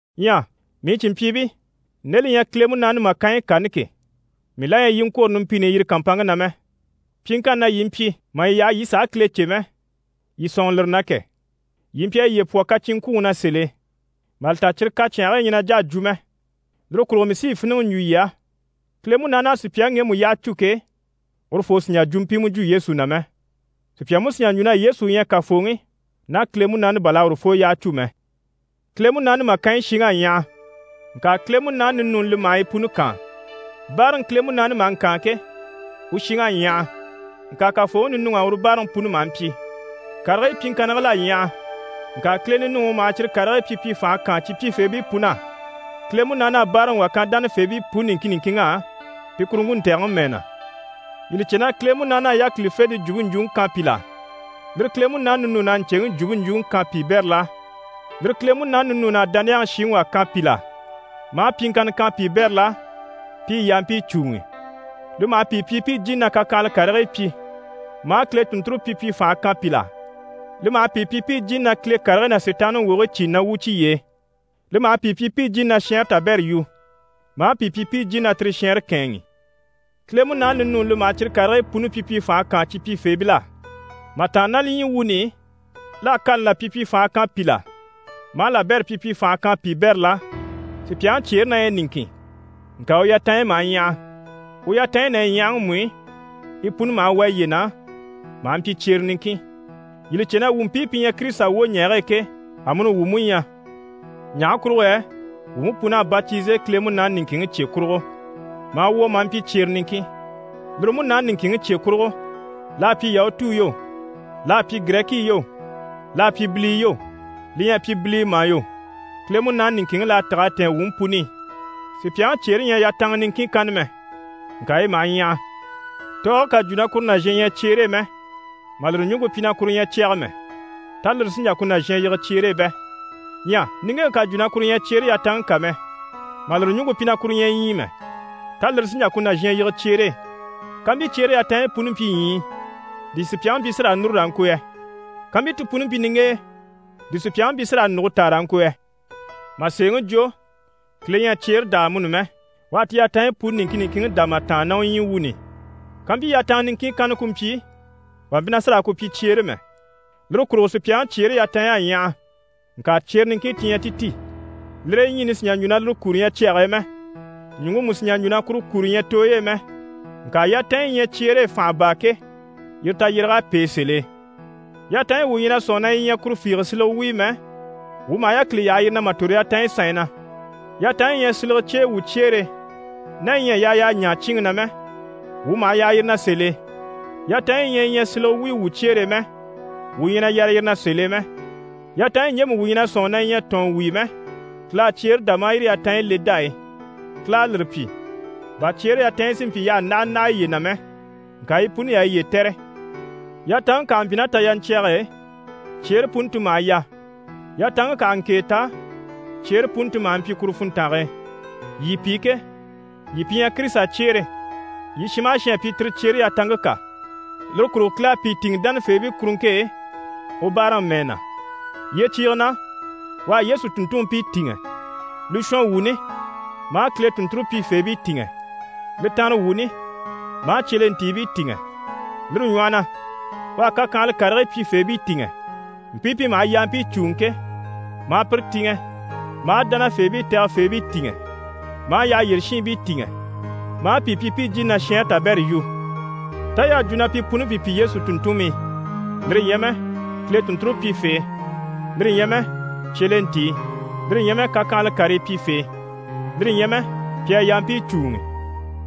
Ɲyɛ mii cìnmpyiibii, nde li ɲyɛ Kile Munaani màkanyi kani ke, mii la ɲyɛ yii i ŋkwôro numpini i yire kàmpanŋke na mɛ. Pyiŋkanni na yii mpyi mà yii yaha yii sàha Kile cè mɛ, yii sɔ̂nŋɔ lire na kɛ! Yii mpyi a yiye pwɔ kacinŋkwuŋi na sèl'e, mà li ta cyire kacyanhigii ɲyɛ na jà a jwo mɛ. Lire kurugo mii sí yi fíniŋɛ n‑jwo yii á, Kile Munaani à sùpyaŋi ŋgemu yyaha cû ke, urufoo sì n‑jà jwumpimɛ jwo Yesu na mɛ. Sùpya mú sì n‑jà n‑jwo na: «Yesu u ɲyɛ Kafooŋi» ná Kile Munaani bà l'à urufoo yyaha cû mɛ. Kile Munaani màkanyi shiŋ'à ɲyaha, ŋka Kile Munaani ninuuni li maha yi puni kaan. Báaraŋi Kile Munaani maha ŋkaan ke, u shiŋ'à ɲyaha. Ŋka Kafooŋi ninuŋ'á uru báaraŋi puni maha mpyi. Karigii pyiŋkannigil'à ɲyaha. Ŋka Kileŋi ninuŋi u maha cyire karigii pyipyi fànha kaan cyi pyifeebii pun'á. Kile Munaani à báaraŋi wà kan dánafeebii puni niŋkin niŋkinŋ'á pi kuruŋke ntɛ̀gɛŋi mɛɛ na. Yii li cè na Kile Munaani à yákilifente jwumpe ɲjwuŋi kan pìl'á. Lire Kile Munaani ninuun'à ɲcèŋi jwumpe ɲjwuŋi kan piibɛril'á. Lire Kile Munaani ninuun'à dániyaŋi shiŋi wà kan pìl'á, maa pyiŋkanna kan piibɛril'á pi i yampii cùuŋi. Li maha pìi pyi pi i jìni na kakyanhala karigii pyi, maa Kile tùnnture pyipyi fànhe kan pìl'á, li maha pìi pyi pi i jìni na Kile karigii ná Sitaanniŋi wogigii cìni na wwû cyiye e, li maha pìi pyi pi i jìni na shɛɛnre tabɛrɛ yu, maa pìi pyi pi i jìni na tire shɛɛnre kɛ̂ɛnŋi. Kile Munaani ninuuni li maha cyire karigii puni pyipyi fànhe kaan cyi pyifeebil'á. Mà tàanna ná li ɲyii wuuni i, l'à kani là pyipyi fànha kan pìl'á, maa labɛrɛ pyipyi fànha kan piibɛril'á. Sùpyaŋi cyeere na ɲyɛ niŋkin, ŋka u yatanɲyi maha ɲyaha. U yatanɲyi ná yi ɲyahaŋi mú i, yi puni maha wà yiye na maha mpyi cyere niŋkin. Yii li cè na wuu mpii pi ɲyɛ Kirisita wwoɲɛɛge e ke, amuni wuu mú ɲyɛ. Ɲaha kurugo yɛ wuu mú puni à batize Kile Munaani niŋkinŋi cye kurugo, maa wwɔ̀ maa mpyi cyere niŋkin, lire Munaani niŋkinŋi cye kurugo, l'à pyi Yahutuu yo, l'à pyi Girɛkii yo, l'à pyi bilii yo, li ɲyɛ a pyi bilii mà yo, Kile Munaani niŋkinŋi l'à tîg'a tɛ̀ɛn wuu mú puni i. Sùpyaŋi cyeere ɲyɛ yatanŋa niŋkin kanna mɛ, ŋka yi maha ɲyaha. Tɔɔge ká jwo na kuru nàzhan ɲyɛ cyeere e mɛ, mà lire ɲùŋke pyi na kuru ɲyɛ cyɛgɛ mɛ, tá lire sí n‑jà ku nàzhan yige cyeere e bɛ? Ɲyɛ niŋgeŋke ká jwo na kuru ɲyɛ cyeere yatanŋke kà mɛ, mà lire ɲùŋke pyi na kuru ɲyɛ ɲyii mɛ, tá lire sí n‑jà ku nàzhan yige cyeere e? Kampyi cyeere yatanɲyi puni mpyi ɲyii, di sùpyaŋi mpyi na sí raa núru raa ŋko yɛ? Kampyi ti puni mpyi niŋgenyɛ, di sùpyaŋi mpyi na sí raa nùge taa raa ŋko yɛ? Mà sèeŋi jwo, Kile ɲyɛ a cyeere dá amuni mɛ, u à ti yatanɲyi puni niŋkin niŋkinŋi dá mà tàanna ná u ɲyii wuuni i. Kampyi yatanŋa niŋkin kanna ku mpyi, wà mpyi na sì raa ku pyi cyeere mɛ. Lire kurugo sùpyaŋi cyeere yatanɲy'à ɲyaha, ŋka cyere niŋkin ti ɲyɛ ti ti. Lire e ɲyiini sì n‑jà n‑jwo na lire kuro ɲyɛ cyɛge e mɛ. Ɲùŋke mú sì n‑jà n‑jwo na kuru kuro ɲyɛ tooyi i mɛ. Ŋka yatanɲyi yi ɲyɛ cyeere e fànha baa ke, yire tayyéreg'à pêe sèl'e. Yatanɲyi wuu ɲyɛ na sɔ̂nŋi na yi ɲyɛ kuru fiige silege wuyo mɛ, wuu maha yákili yaha yire na mà tòro yatanɲyi sanɲyi na. Yatanɲyi yi ɲyɛ silege cyeyi wuu cyeere e, ná yi ɲyɛ a yaa y'a ɲaa cyíinŋi na mɛ, wuu maha yaha yire na sèl'e. Yatanɲyi yi ɲyɛ yi ɲyɛ silege wuyo wuu cyeere e mɛ, wuu ɲyɛ na yare yire na sèl'e mɛ. Yatanɲyi ɲjemu wuu ɲyɛ na sɔ̂nŋi na yi ɲyɛ tɔ̀ɔn wuyo mɛ, Kile à cyeere dá maa yire yatanɲyi le dá e. Kile à lire pyi, bà cyeere yatanɲyi si mpyi y'àha ndáha ndáha yiye na mɛ. Ŋka yi puni y'a yiye tɛ̀re. Yatanŋke kà ha mpyi ná tayaɲcyage e, cyeere puni ti maha yà. Yatanŋke kà ha ŋkèe ta, cyeere puni ti maha mpyi kuru funntange e. Yii pi ke, yii pi ɲyɛ Kirisita cyeere, yii shin maha shin à pyi tire cyeere yatanŋke kà. Lire kurugo Kile à pìi tìŋɛ dánafeebii kuruŋke e u báaraŋi mɛɛ na. Yyecyiige na, u à Yesu tùnntunmpii tìŋɛ, li shɔnwuuni maa Kile tùnnture pyifeebii tìŋɛ, li tanrewuuni maa cyelentiibii tìŋɛ. Lire ɲwɔhɔ na, u à kakyanhala karigii pyifeebii tìŋɛ, mpii pi maha yampii cùuŋi ke, maa pire tìŋɛ, maa dánafeebii tɛgɛfeebii tìŋɛ, maa yyaha yyére shiinbii tìŋɛ, maa pìi pyi pi i jìni na shɛɛnre tabɛrɛ yu. Tá y'à jwo na pi puni pi pyi Yesu tùnntunmii? Lire ɲyɛ mɛ, Kile tùnnture pyifee? Lire ɲyɛ mɛ, cyelentii? Lire ɲyɛ mɛ, kakyanhala karii pyifee? Lire ɲyɛ mɛ, pi a yampii cùuŋi?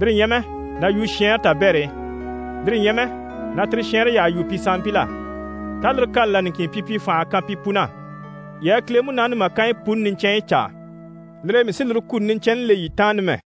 Lire ɲyɛ mɛ, na yu shɛɛnre tabɛr'e? Lire ɲyɛ mɛ, na tire shɛɛnre yyaha yu pi sanmpil'á? Tá lire kani là niŋkin pyipyi fành'à kan pi pun'á? Yii a Kile Munaani màkanyi puni niɲcɛnɲyi caa. Lire e mii sí lire kuni niɲcɛnni le yii taan numɛ.